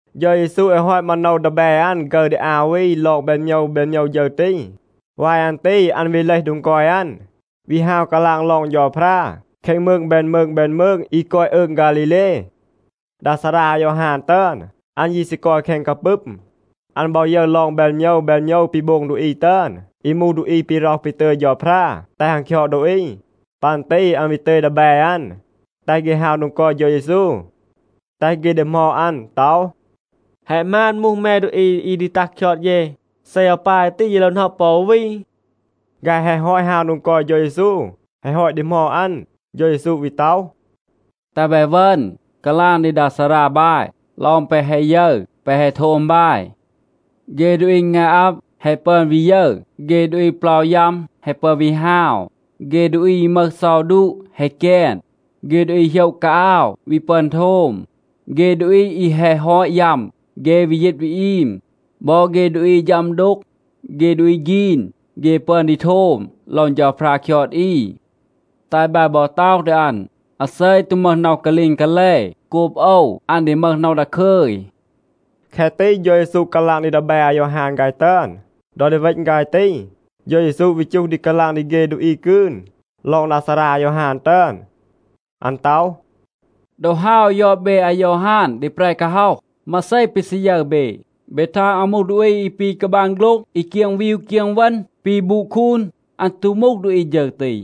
เฌา เยซู แฮะ ฮอต มาโนว ดีแบ อัน ฆึร ดี อา วี ลอง แบน โมยว แบน โมยว ฌึร ตี. วาย อัน ตี อัน วี เลห โดง กอย อัน, วี ฮาว กาลาง ลอง เฌาพรา แคง มืง แบน มืง แบน มืง อี กอย อืง ฆาลีเล. ดา ซารา อายอฮาน ตึอน, อัน ยี ซี กอย แคง กาปึม. อัน บอ ยึร ลอง แบน โมยว แบน โมยว ปี โบง ดูอี ตึอน อี มูห ดูอี ปี ร็อห ปี ตึย เฌาพรา แตห อัน คยอด ดูอี. ปัน ตี อัน วี ตึย ดีแบ อัน, แตห เฆ ฮาว โดง กอย เฌา เยซู, แตห เฆ ดีหมอด อัน ต็อห, “แฮะ หมาน มูห แม ดูอี อี ดี ตัห คยอด เย? เซ อาว ปาย ตี, เย โลว หน็อะ ปอ วี?” ฆาย แฮะ ฮอต ฮาว โดง กอย เฌา เยซู, แฮะ ฮอต ดีหมอด อัน, เฌา เยซู วี ต็อห, “แตห บาย เวณ, กาลาง ดี ดา ซารา บาย ลอง แปะ แฮะ ยึร แปะ แฮะ โทม บาย. เฆ ดูอี งาย อับ แฮะ ปึอน วี ยึร. เฆ ดูอี เปลา ยัม แฮะ ปึอน วี ฮาว. เฆ ดูอี อี มึห เซา ดูะa แฮะ แกน. เฆ ดูอี โหยะ กาอาว วี ปึอน โทม. เฆ ดูอี อี แฮะ ฮอต ยัม, เฆ วี ยีต วี อีม. บอ เฆ ดูอี อี ฌัม ดูก, เฆ ดูอี ฆีน, เฆ ปึอน ดี โทม ลอง เฌาพรา คยอด อี. แตห บาย บอ ต็อห ดี อัน, อาเซ ตู มึห น็อห กาลีง กาแล โกบ โอว, อัน ดี มึห น็อห ดาคึย.” แคะ ตี เฌา เยซู กาลาง ดี ดีแบ อายอฮาน ฆาย ตึอน. ดอ ดี เวณ ฆาย ตี, เฌา เยซู วี จูห ดี กาลาง ดี เฆ ดูอี กืน ลอง ดา ซารา อายอฮาน ตึอน. อัน ต็อห, “ดอ ฮาว ยอด เบ อายอฮาน ดี แปร กาฮ็อห, มาเซ ปี ซี ยึร เบ? เบ ทาง อัน มูห ดูอี อี ปี กาบาง โฆ็ลง, อี เกียง วีว เกียง เวณ ปี บูด คูน? อัน ตู มูห ดูอี ฌึร ตี.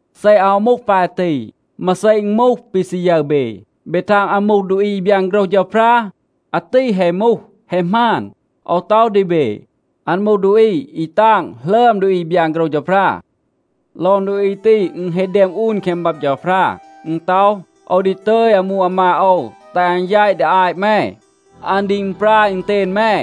เซ อาว มูห ปาย ตี, มาเซ อึณ มูห, ปี ซี ยึร เบ? เบ ทาง อัน มูห ดูอี อี บยาน โฆรห เฌาพรา? อาตี แฮะ มูห, แฮะ หมาน. โอว ต็อห ดี เบ, อัน มูห ดูอี อี ตาง หลึอม ดูอี อี บยาน โฆรห เฌาพรา. ลอง ดูอี ตี อึณ แฮะ แดม อูน แคง บับ เฌาพรา. อึณ ต็อห, ‘โอว ดี ตึย อามู อามาด โอว, แตห อัน แยต ดี อาต แม. อัน ดี อึณปราย อึณเตณ แม.’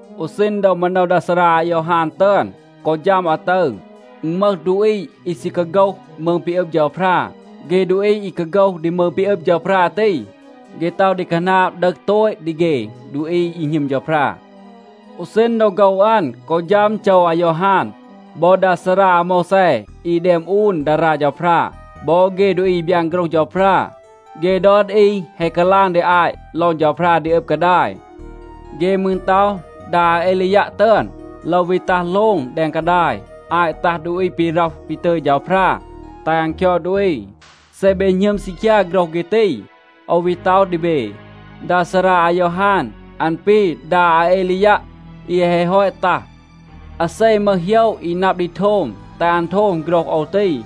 อู ซีณ ดอ มาโนว ดา ซารา อายอฮาน ตึอน กอ ฌัม อาตึร, อึณ มึห ดูอี อี ซี กาโฆห มืง ปี อึบ เฌาพรา. เฆ ดูอี อี กาโฆห ดี มืง ปี อึบ เฌาพรา ตี, เฆ ต็อห ดี คาหนาบ ดึห โตต ดี เฆ ดูอี อี หณึม เฌาพรา. อู ซีณ ดอ โฆว อัน กอ ฌัม โจว อายอฮาน, บอ ดา ซารา อาโมวแซ อี แดม อูน ดารา เฌาพรา บอ เฆ ดูอี อี บยาน โฆรห เฌาพรา, เฆ ดอน อี แฮะ กาลาง ดี อาต ลอง เฌาพรา ดี อึบ กาดาย. เฆ มืร ต็อห, ดา อาเอลียัะ ตึอน โลว วี ตัห โลง แดง กาดาย อาต ตัห ดูอี ปี ร็อห ปี ตึย เฌาพรา แตห อัน คยอด ดูอี. เซ เบ หณึม ซีคยา โฆรห เฆ ตี, โอว วี ต็อห ดี เบ, ดา ซารา อายอฮาน, อัน ปี ดา อาเอลียัะ อี แฮะ ฮอต ตัห. อาเซ มึห โหยะ อี นับ ดี โทม, แตห อัน โทม โฆรห โอว ตี.”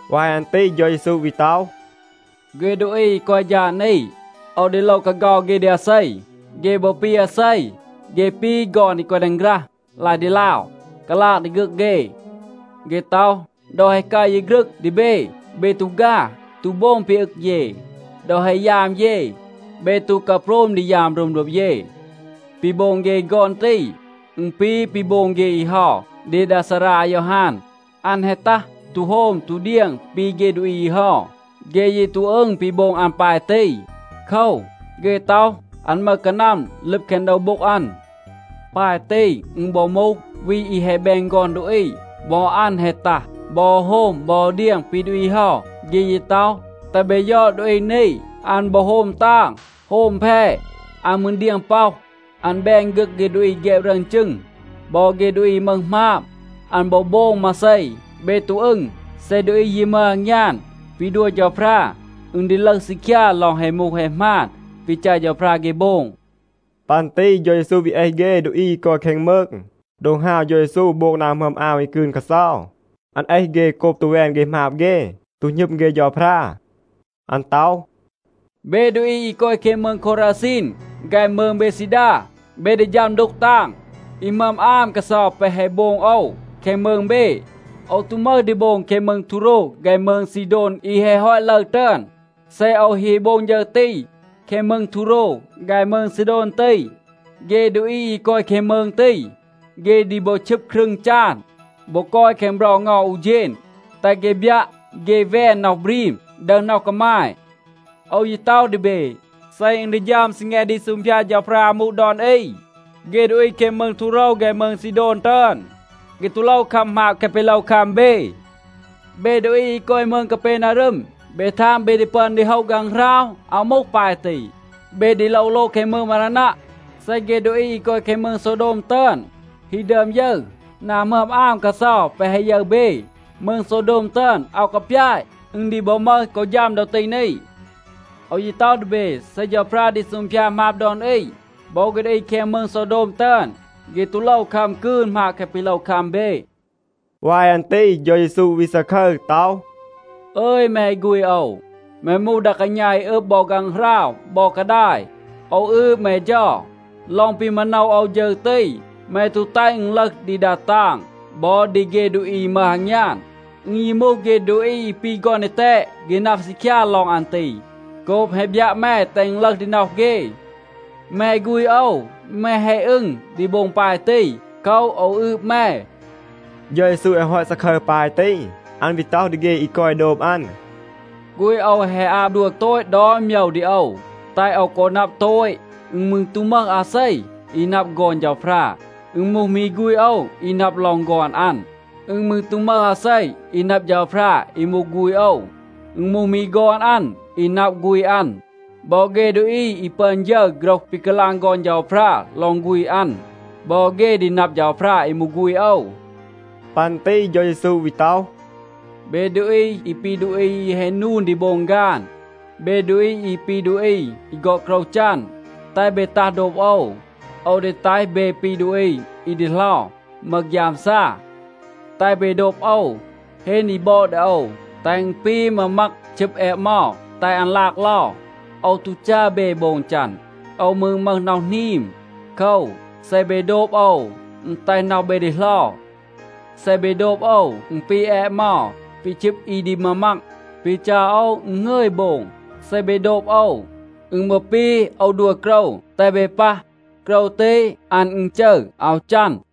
วาย อัน ตี เฌา เยซู วี ต็อห, “เฆ ดูอี อี กอย ฌาด นี, โอว ดี โลว กาเฆา เฆ ดี อาเซ? เฆ บอ ปี อาเซ? เฆ ปี ฆอน อี กอย แดง ฆรัห, ลาย ดีลาว, กาลาง ดี ฆึก เฆ. เฆ ต็อห, ‘ดอ แฮะ กัร เย ฆรึง ดี เบ, เบ ตู ฆา, ตู โบง ปี อึง เย. ดอ แฮะ ยาม เย, เบ ตู กาโพรม ดี ยาม รึม โดบ เย.’ ปี โบง เฆ ฆอน ตี, อึณ ปี ปี โบง เฆ อี เฮา ดี ดา ซารา อายอฮาน. อัน แฮะ ตัห, ตู โฮม ตู เดียง ปี เฆ ดูอี เฮา. เฆ ยี ตู อึง ปี โบง อัน ปาย ตี. โคว, เฆ ต็อห, อัน มึห กานัม ลึบ แคง โดว โบ็ง อัน. ปาย ตี อึณ บอ มูห วี อี แฮะ แบน ฆอน ดูอี. บอ อัน แฮะ ตัห, บอ โฮม บอ เดียง ปี ดูอี เฮา. เฆ ยี ต็อห, ‘แตห เบ ยอด ดูอี นี. อัน บอ โฮม ตาง, โฮม แพ, อัน มืร เดียง ป็อห. อัน แบน ฆึก เฆ ดูอี อี แฆบ รึอน จึง บอ เฆ ดูอี อี มึห หมาบ.’ อัน บอ โบง มาเซ, เบ ตู อึง. เซ ดูอี ยี มึห อางยาน ปี ดัว เฌาพรา, อึณ ดี ลึห ซีคยา ลอง แฮะ มูห แฮะ หมาน ปี จัร เฌาพรา เฆ โบง.” ปัน ตี เฌา เยซู วี เอห เฆ ดูอี อี กอย แคง มืง โดง ฮาว เฌา เยซู โบง นา หมึอม อาม อี กืน กาเซา. อัน เอห เฆ โกบ ตู แวน เฆ หมาบ เฆ, ตู หณึม เฆ เฌาพรา. อัน ต็อห, “เบ ดูอี อี กอย แคง มืง โควราซีน ฆาย มืง เบดซีดา, เบ ดี ฌัม ดูก ตาง. อี หมึอม อาม กาเซา แปะ แฮะ โบง โอว แคง มืง เบ, โอว ตู มึห ดี โบง แคง มืง ทูโรว ฆาย มืง ซีโดน อี แฮะ ฮอต ลึร ตึอน. เซ โอว ฮี โบง ฌึร ตี แคง มืง ทูโรว ฆาย มืง ซีโดน ตี, เฆ ดูอี อี กอย แคง มืง ตี, เฆ ดี บอ ชึบ ครึง จาน บอ กอย แคง เบรา เงา อู เฌณ, แตห เฆ บยัะ, เฆ แวน น็อห บรีม, ดึห น็อห กามาย. โอว ยี ต็อห ดี เบ, เซ อึณ ดี ฌัม ซีแง ดี ซูงพยาด เฌาพรา อามู ดอน อี, เฆ ดูอี แคง มืง ทูโรว ฆาย มืง ซีโดน ตึอน, เฆ ตู โลว คัม หมาบ แคะ ปี โลว คัม เบ. เบ ดูอี อี กอย มืง กาเปนารึม, เบ ทาง, เบ ดี ปึอน ดี โฮะ ฆางหราว? อาว มูห ปาย ตี. เบ ดี โลว โลง แคง มืง มารานัะ. เซ เฆ ดูอี อี กอย แคง มืง โซวโดม ตึอน ฮี ดึอม ยึร นา หมึอม อาม กาเซา แปะ แฮะ ยึร เบ, มืง โซวโดม ตึอน อาว กาปยาต, อึณ ดี บอ มึห กอ ฌัม ดอ ตี นี. โอว ยี ต็อห ดี เบ, เซ เฌาพรา ดี ซูงพยาด หมาบ ดอน อี, บอ เฆ ดูอี แคง มืง โซวโดม ตึอน, เฆ ตู โลว คัม กืน หมาบ แคะ ปี โลว คัม เบ.” วาย อัน ตี เฌา เยซู วี ซาคึร ต็อห, “อึย แม ฆูณ โอว, แม มูห ดา กาณา อี อึบ บอ ฆางหราว บอ กาดาย. โอว อืบ แม เฌา. ลอง ปี มาโนว โอว ฌึร ตี, แม ตู แตห อึณ ลึห ดี ดา ตาง บอ ดี เฆ ดูอี อี มึห อางยาน. อึณ ยี มูห เฆ ดูอี อี ปี ฆอน ดีแตด, เฆ นับ ซีคยา ลอง อัน ตี โกบ แฮะ บยัะ แม, แตห อึณ ลึห ดี น็อห เฆ. แม ฆูณ โอว, แม แฮะ อึง ดี โบง ปาย ตี. โคว, โอว อืบ แม.” เฌา เยซู แฮะ ฮอต ซาคึร ปาย ตี, อัน วี ต็อห ดี เฆ อี กอย โดบ อัน, “ฆูณ โอว แฮะ อาบ ดัว โตต ดอน โมยว ดี โอว, แตห โอว กอ นับ โตต. อึณ มืร ตู มึห อาเซ อี นับ ฆอน เฌาพรา. อึณ มูห มี ฆูณ โอว อี นับ ลอง ฆอน อัน. อึณ มืร ตู มึห อาเซ อี นับ เฌาพรา อี มูห ฆูณ โอว. อึณ มูห มี ฆอน อัน อี นับ ฆูณ อัน. บอ เฆ ดูอี อี ปึอน ยึร โฆรห ปี กาลาง ฆอน เฌาพรา ลอง ฆูณ อัน, บอ เฆ ดี นับ เฌาพรา อี มูห ฆูณ โอว.” ปัน ตี เฌา เยซู วี ต็อห, “เบ ดูอี อี ปี ดูอี อี แฮะ นูน ดี โบง ฆาน, เบ ดูอี อี ปี ดูอี อี ฆอด โกรว จัน, แตห เบ ตัห โดบ โอว. โอว ดี แตห เบ ปี ดูอี อี ดีเหลา, มึห ฆยามซา. แตห เบ โดบ โอว, เฮน อี บอด ดี โอว, แตห อึณ ปี มามัก ชึบ แอะเมา แตห อัน ลาก เลา. โอว ตู จัร เบ โบง จัน. โอว มืร มึห น็อห หนีม. โคว, เซ เบ โดบ โอว, อึณ แตห น็อห เบ ดีเหลา. เซ เบ โดบ โอว, อึณ ปี แอะเมา ปี ชึบ อี ดี มามัก. ปี จัร โอว, อึณ หงึย โบง. เซ เบ โดบ โอว, อึณ บอ ปี โอว ดัว โกรว, แตห เบ ปัห. โกรว ตี, อัน อึณจึร, อาว จัน.”